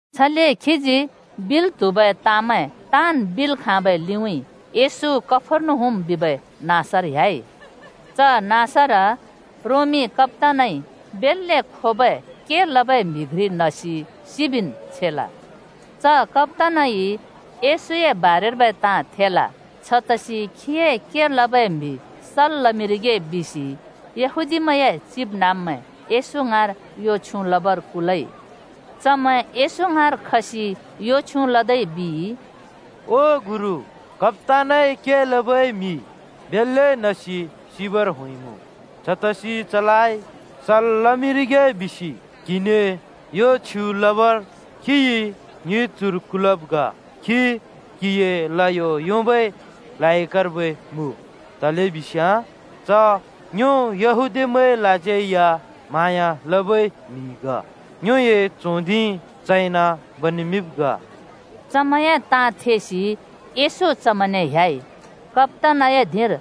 छले खीजी बिल् त्हुबै ताँमैं ताँन् बिल् खाँबै लिउँइँ येशू कफर्नहुम बिबै नाँसर ह्‍याइ। च नाँसर रोमी कप्‍तानइ बेल्‍ले खोबै के लबै म्हि घ्रि नसि सिबिन् छेल। च कप्‍तानइ येशूए बारेर्बै ताँ थेल। छतसि खीए के लबै म्हि सल् लमिंरिगे बिसि यहूदीमैंए चिबनाँब्मैं येशू ङाँर यो छ्युँ लबर कुलइ। चमैं येशू ङाँर खसि यो छ्युँ लदै बिइ, “ओ गुरु, कप्‍तानए के लबै म्हि बेल्‍ले नसि सिबर होंइमुँ, छतसि चलाइ सल् लमिंरिगे बिसि क्हिने यो छ्युँ लबर चइ ङि चुर कुलब् ग। च क्हिए ल्हयो योंबै लायकर्बै मुँ। तलेबिस्याँ च ङ्यो यहूदीमैंलाज्यै या म्‍हाँया लबै म्हि ग, ङ्योए च्हों धिं चइन बनेमिंब् ग।” चमैंए ताँ थेसि येशू चमैंने ह्‍याइ। कप्‍तानए धिंर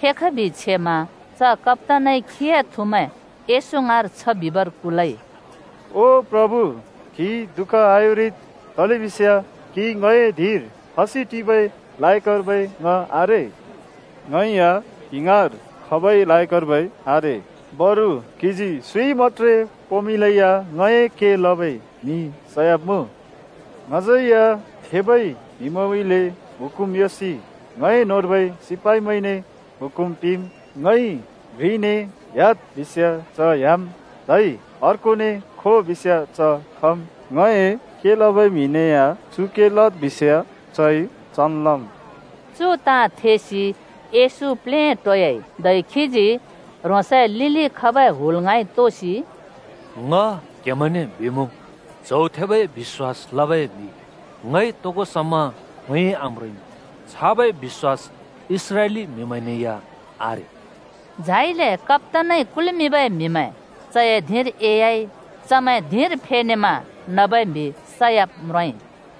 फेखबि छेमा च कप्‍तानइ ह्रोंसए थुमैं येशू ङाँर छ बिबर कुलइ: “ओ प्रभु, क्‍हि दुःख आयोंरिद् तलेबिस्याँ क्‍हि ङए धिंर खसि टिबै लायकर्बै ङ आरे। ङै या क्हिए ङाँर खबै लायकर्बै आरे। बरु क्‍हिजी सुँइ मत्‍त्रे पोंमिंलै या ङए के लबै म्हि सयाब्‍मुँ। ङज्‍यै या थेबै म्‍हिमैंउँइँले हुकुम योंसि ङए न्‍होंर्बै सिपाइमैंने हुकुम पिंम्। ङइ घ्रिने ‘ह्‍याद्’ बिस्‍याँ च ह्‍याम्, धै अर्कोने ‘खो’ बिस्‍याँ च खम् ङए के लबै म्हिने या ‘ङइ तो लद्’ बिमुँ चइ चन् लम्।” चु ताँ थेसि येशू प्लेटोयाइ, धै खीजी ह्रोंसए लिलि खबै हुल ङाँइ तोसि “ङ क्‍हेमैंने बिमुँ, च्हौ थेबै बिश्‍वास लबै म्‍हि ङइ तोगो समा खोंयोंइ आम्रोंइमुँ। छाबै बिश्‍वास इस्राएली म्‍हिमैंने या आरे।” झाइले कप्‍तानइ कुल्मिंबै म्‍हिमैं चए धिंर एह्‍याइ चमैं धिंर फेनेमा नबै म्हि सयाब् म्रोंइ।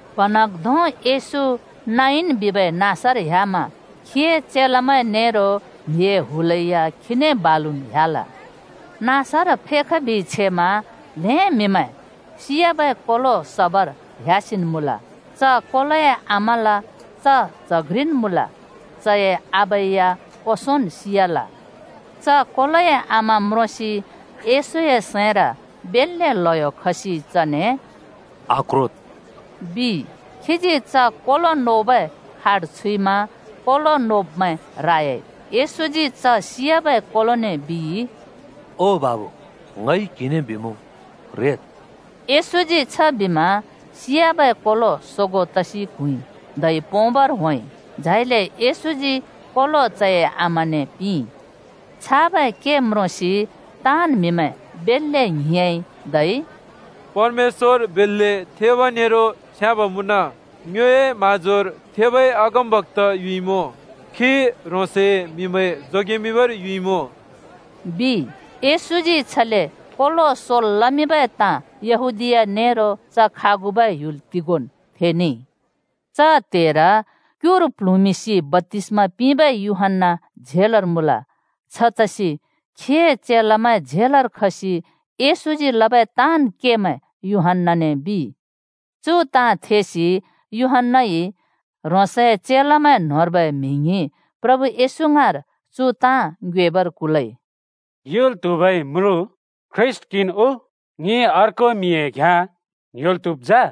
प्हाँन्हाँग्धों येशू नाइन बिबै नाँसर ह्‍यामा खीए चेलामैं नेरो म्हिए हुलै या खीने बालुन् ह्‍याल। नाँसर फेखबि छेमा ल्‍हें म्‍हिमैं सि‍याबै कोलो सबर ह्‍यासिन् ‍मुँल। च कोलोए आमाल च च्‍ह घ्रिन् मुँल, चए आबा या ओंसोंन् सि‍याल। च कोलोए आमा म्रोंसि येशूए सैंर बेल्‍ले ल्‍हयो खसि चने “आक्रोद्,” बिइ। खीजी च कोलो नोबै खाट छुइमा कोलो नोब्‍मैं रायाइ। येशूजी च सि‍याबै कोलोने बिइ, “ओ बाबु, ङइ क्हिने बिमुँ, ‘रेद्!’” येशूजी छबिमा सियाबै कोलो सोगों तसि क्हुँइ, धै पोंबर होंइ। झाइले येशूजी कोलो चए आमाने पिंइ। छाबै के म्रोंसि ताँन् म्‍हिमैं बेल्‍ले ङ्हिंयाँइ, धै “परमेश्‍वर बेल्‍ले थेब नेरो छ्याँब् मुँन! ङ्योए म्‍हाँजोर थेबै अगमबक्‍ता युइमुँ! खी ह्रोंसए म्‍हिमैं जोगेमिंबर युइमुँ,” बिइ। येशूजी छले कोलो सोल् लमिंबै ताँ यहूदीया नेरो च खागुबै ह्‍युल तिगोंन् थेनेइ। च त्‍हेर क्युर प्ल्हुँसि बप्‍तिस्मा पिंबै यूहन्‍ना झेलर मुँल। छतसि खीए चेलामैं झेलर खसि येशूजी लबै ताँन् केमैं यूहन्‍नाने बिइ। चु ताँ थेसि यूहन्‍नाइ ह्रोंसए चेलामैं न्होंर्बै म्हि ङ्हिं प्रभु येशू ङाँर चु ताँ ङ्योएबर कुलइ, “युल् त्हुबै म्रुँ ख्रीष्‍ट क्‍हिन् उ? ङिइ अर्को म्‍हिए घ्याँ ङ्‍ह्‍योल् त्‍हुब् जा?”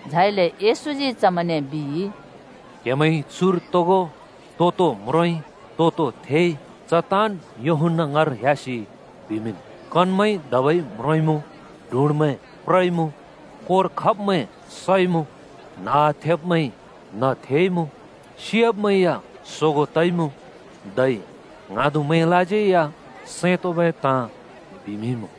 झाइले येशूजी चमैंने बिइ, “क्‍हेमैंइ चुर तोगो तो-तो म्रोंइ तो-तो थेइ च ताँन् यूहन्‍ना ङाँर ह्‍यासि बिमिंन्। कनमैंइ धबै म्रोंइमुँ, डुँड्मैं प्रइमुँ, कोर खब्‍मैं सइमुँ, न्हउसिमैंइ न्‍ह थेइमुँ, सियाब्‍मैं या सोगो तइमुँ धै ङ्हाँदुमैंलाज्यै या सैं तोंबै ताँ बिमिंइमुँ बिद्।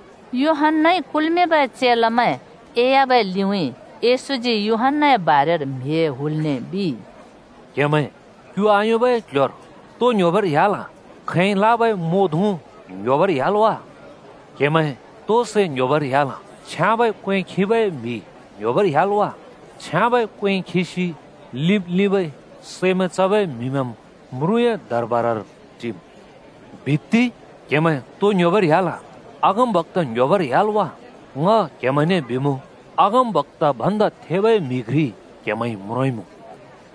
यूहन्‍नाइ कुल्मिंबै चेलामैं एह्‍याबै लिउँइँ येशूजी यूहन्‍नाए बारेर म्हिए हुलने बिइ, “क्‍हेमैं क्यु आयोंबै क्ल्ह्‍योर तो ङ्‌ह्‍योबर ह्‍याल? खैंइ लाबै म्वो धुँ ङ्‌ह्‍योबर ह्‍याल् वा? क्‍हेमैं तो सै ङ्‌ह्‍योबर ह्‍याल? छ्याँबै क्‍वें खिबै म्‍हि ङ्‌ह्‍योबर ह्‍याल् वा? छ्याँबै क्‍वें खिसि लिंब्-लिंबै सैमैं चबै म्‍हिमैंम् म्रुँए दरबारर टिम्। बित्ति! क्‍हेमैं तो ङ्‌ह्‍योबर ह्‍याल? अगमबक्‍ता ङ्ह्‍योबर ह्‍याल् वा? ङ क्‍हेमैंने बिमुँ, अगमबक्‍ता भन्दा थेबै म्‍हि घ्रि क्‍हेमैंइ म्रोंइमुँ!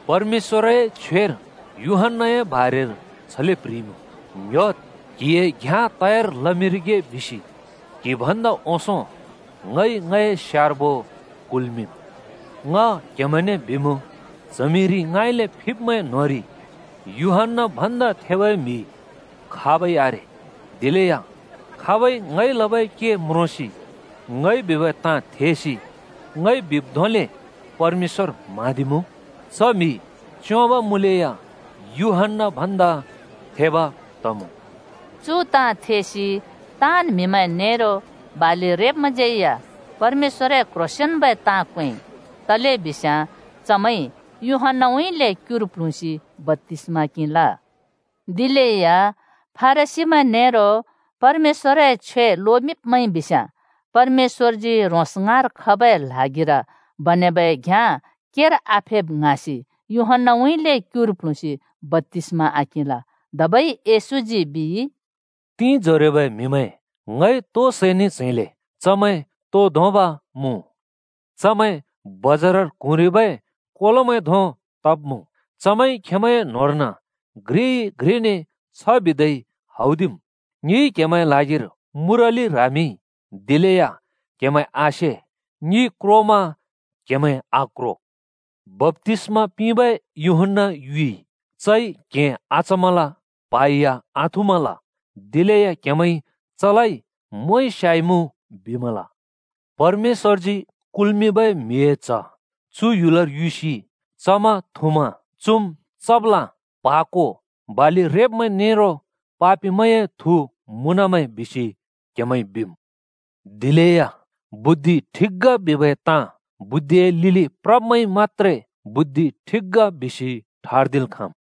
परमेश्‍वरए छ्वेर यूहन्‍नाए बारेर छले प्‍ह्रिइमुँ: ‘ङ्‍ह्‍योद्! क्‍हिए घ्‍याँ तयार लमिंरिगे बिसि क्हि भन्दा ओंसों ङइ ङए स्यार्बो कुल्मिंम्।’ ङ क्हेमैंने बिमुँ, च्हमिरि ङाँइले फिब्मैं न्होंरि यूहन्‍ना भन्दा थेबै म्‍हि खाबै आरे, दिलेया खाबइ ङइ लबै के म्रोंसि ङइ बिबै ताँ थेसि ङइ बिब् धोंले परमेश्‍वर म्हाँदिमुँ, च म्‍हि च्‍योंब मुँलेया यूहन्‍ना भन्दा थेब तमुँ।” चु ताँ थेसि ताँन् म्‍हिमैं नेरो बालि रेब्‍मैंज्‍यै या परमेश्‍वरए क्ह्रोंसेंन्बै ताँ क्वेंइ। तलेबिस्याँ चमैंइ यूहन्‍नाउँइँले क्युर प्लुँसि बप्‍तिस्मा किंल। दिलेया फरिसीमैं नेरो परमेश्‍वरए छ्वे लोमिंब्मैंइ बिस्याँ परमेश्‍वरजी ह्रोंस ङाँर खबै ल्हागिर बनेबै घ्याँ केर आफेब् ङ्हाँसि यूहन्‍नाउँइँले क्युर प्लुँसि बप्‍तिस्मा आकिंल। धबै येशूजी बिइ, “तिंजरोबै म्‍हिमैं ङ‍इ तो सैने च्‍हैंले? चमैं तो धोंब मुँ? चमैं बजारर क्हुँरिबै कोलोमैं धों तब् मुँ, चमैंइ खेंमैंए न्होंर्न घ्रिइ-घ्रिने छ बिदै हौदिम्। ‘ङिइ क्‍हेमैंए ल्हागिर मुराली ह्रामिंइ, दिलेया क्हेमैं आसे। ङि क्रोमा क्हेमैं आक्रो।’ बप्‍तिसमा पिंबै यूहन्‍ना युइ, चइ क्हें आचमल प्हा या आथुँमल। दिलेया क्‍हेमैंइ चलाइ ‘मोंइ स्‍याइमुँ’ बिमल। परमेश्‍वरजी कुल्मिंबै म्हिए च्ह चु ह्‍युलर युसि चमा, थुँमा ‘चुम् चप्ला प्हाको बालि रेब्‍मैं नेरो पापिमैंए थु मुँनमैं,’ बिसि क्‍हेमैंइ बिम्। दिलेया बुद्धि ठिक ग बिबै ताँ बुद्धिए लिलि प्रब्मैंइ मत्‍त्रे बुद्धि ठिक ग बिसि ठर्दिल् खाँम्।”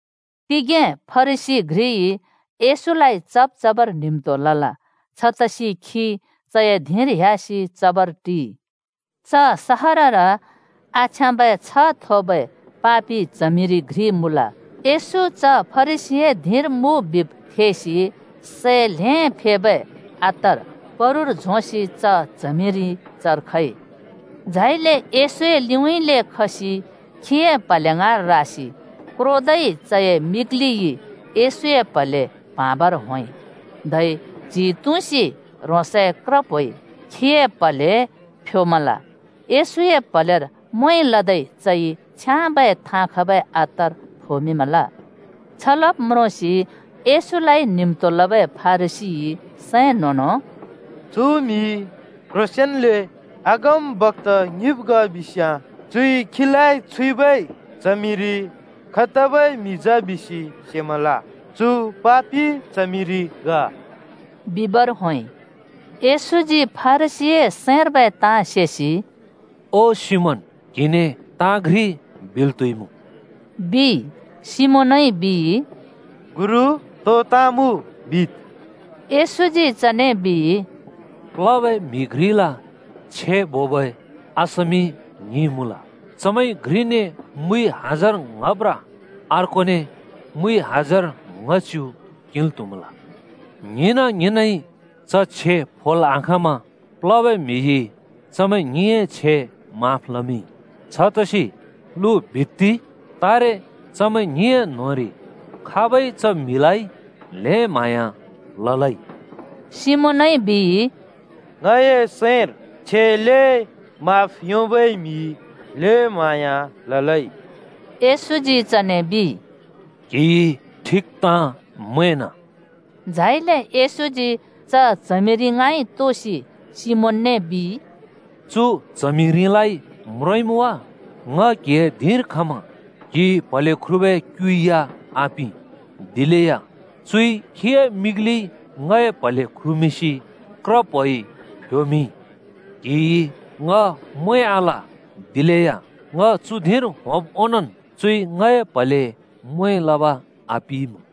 तिगें फरिसी घ्रिइ येशूलाइ चब् चबर न्हिम्तो लल। छतसि खी चए धिंर ह्‍यासि चबर टिइ। च सहरर आछ्याँबै छ्ह थोबै पापि च्हमिरि घ्रि मुँल। येशू च फरिसीए धिंर मुँ बिब् थेसि सै ल्हें फेबै अत्तर पुरुर झोंसि च च्हमिरि चर खइ। झाइले येशूए लिउँइँले खसि खीए प्‍हले ङाँर रासि क्रोदै चए मिग्लिइ येशूए प्‍हले प्हँवाबर होंइ, धै च्हि तुँसि ह्रोंसए क्रप्होइ खीए प्‍हले फ्‍योमल। येशूए प्‍हलेर म्वें लदै चइ छ्याँबै थाँ खबै अत्तर फोमिंमल। छ लब् म्रोंसि येशूलाइ न्हिम्तो लबै फरिसीइ सैं न्हों-न्हों “चु म्‍हि क्‍ह्रोंसेंन्ले अगमबक्‍ता ङिब् ग बिस्‍याँ चुइ खीलाइ छुइबै च्हमिरि खैतबै म्हि जा बिसि सेमल। चु पापि च्हमिरि ग!” बिबर होंइ। येशूजी फरिसीए सैंर्बै ताँ सेसि “ओ सिमोन क्‍हिने ताँ घ्रि बिल् त्‍हुइमुँ,” बिइ। सिमोनइ बिइ, “तो ताँ मुँ गुरु? बिद्।” येशूजी चने बिइ, “प्लबै म्हि घ्रिल छे बोबै असामि ङ्हिं मुँल। चमैंइ घ्रिने हजार ङ्‍ह अर्कोने मुइ ङ्‍हच्‍यु हजार किंल् त्हुमल। ङ्हिंना-ङ्हिंनइ च छे फोल् आखाँमा प्लबै म्हिइ चमैं ङ्हिंए छे माफ लमिंइ। छतसि लु बित्ति! तारे चमैं ङ्हिंए न्‍होंरि खाबइ च म्हिलाइ ल्हें म्‍हाँया ललै?” सिमोनइ बिइ, “ङए सैंर, छे ल्हें माफ योंबै म्हिइ ल्‍हें म्‍हाँया ललै।” येशूजी चने बिइ, “क्‍हिइ ठिक ताँ मैंना।” झाइले येशूजी च च्हमिरि ङाँइ तोसि सिमोनने बिइ, “चु च्हमिरिलाइ म्रोंइमुँ वा? ङ क्‍हिए धिंर खमा क्‍हिइ प्‍हले ख्रुबै क्‍यु या आपिं, दिलेया चुइ खीए मिग्लिइ ङए प्‍हले ख्रुमिंसि क्रप्होइ फ्‍योमिंइ। क्‍हिइ ङ म्वें आल, दिलेया ङ चु धिंर होंब् ओंनोंन् चुइ ङए प्‍हले म्वें लब आपिइमुँ।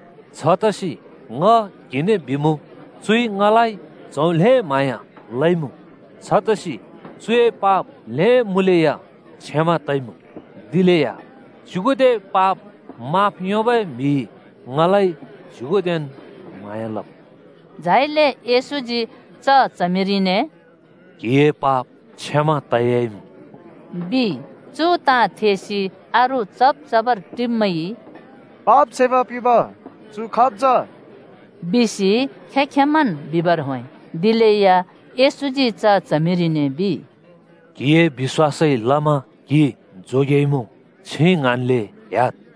छतसि ङ क्‍हिने बिमुँ, चुइ ङलाइ च्‍हौ ल्‍हें म्‍हाँया लइमुँ। छतसि चुए पाप ल्हें मुँलेया क्षमा तइमुँ, दिलेया च्‍युगुदे पाप माफ योंबै म्हिइ ङलाइ च्युगुदेन् म्हाँया लमुँ।” झाइले येशूजी च च्हमिरिने “क्‍हिए पाप क्षमा तयाइमुँ,” बिइ। चु ताँ थेसि अरू चब् चबर टिब्‍मैंइ, “पाप क्षमा पिंब चु खाब् जा?” बिसि खें-खेंमैंन् बिबर होंइ। दिलेया येशूजी च च्हमिरिने बिइ, “क्‍हिए बिश्‍वासइ लमा क्‍हि जोगेएइमुँ, छिं ङ्हाँन्ले ह्‍याद्।”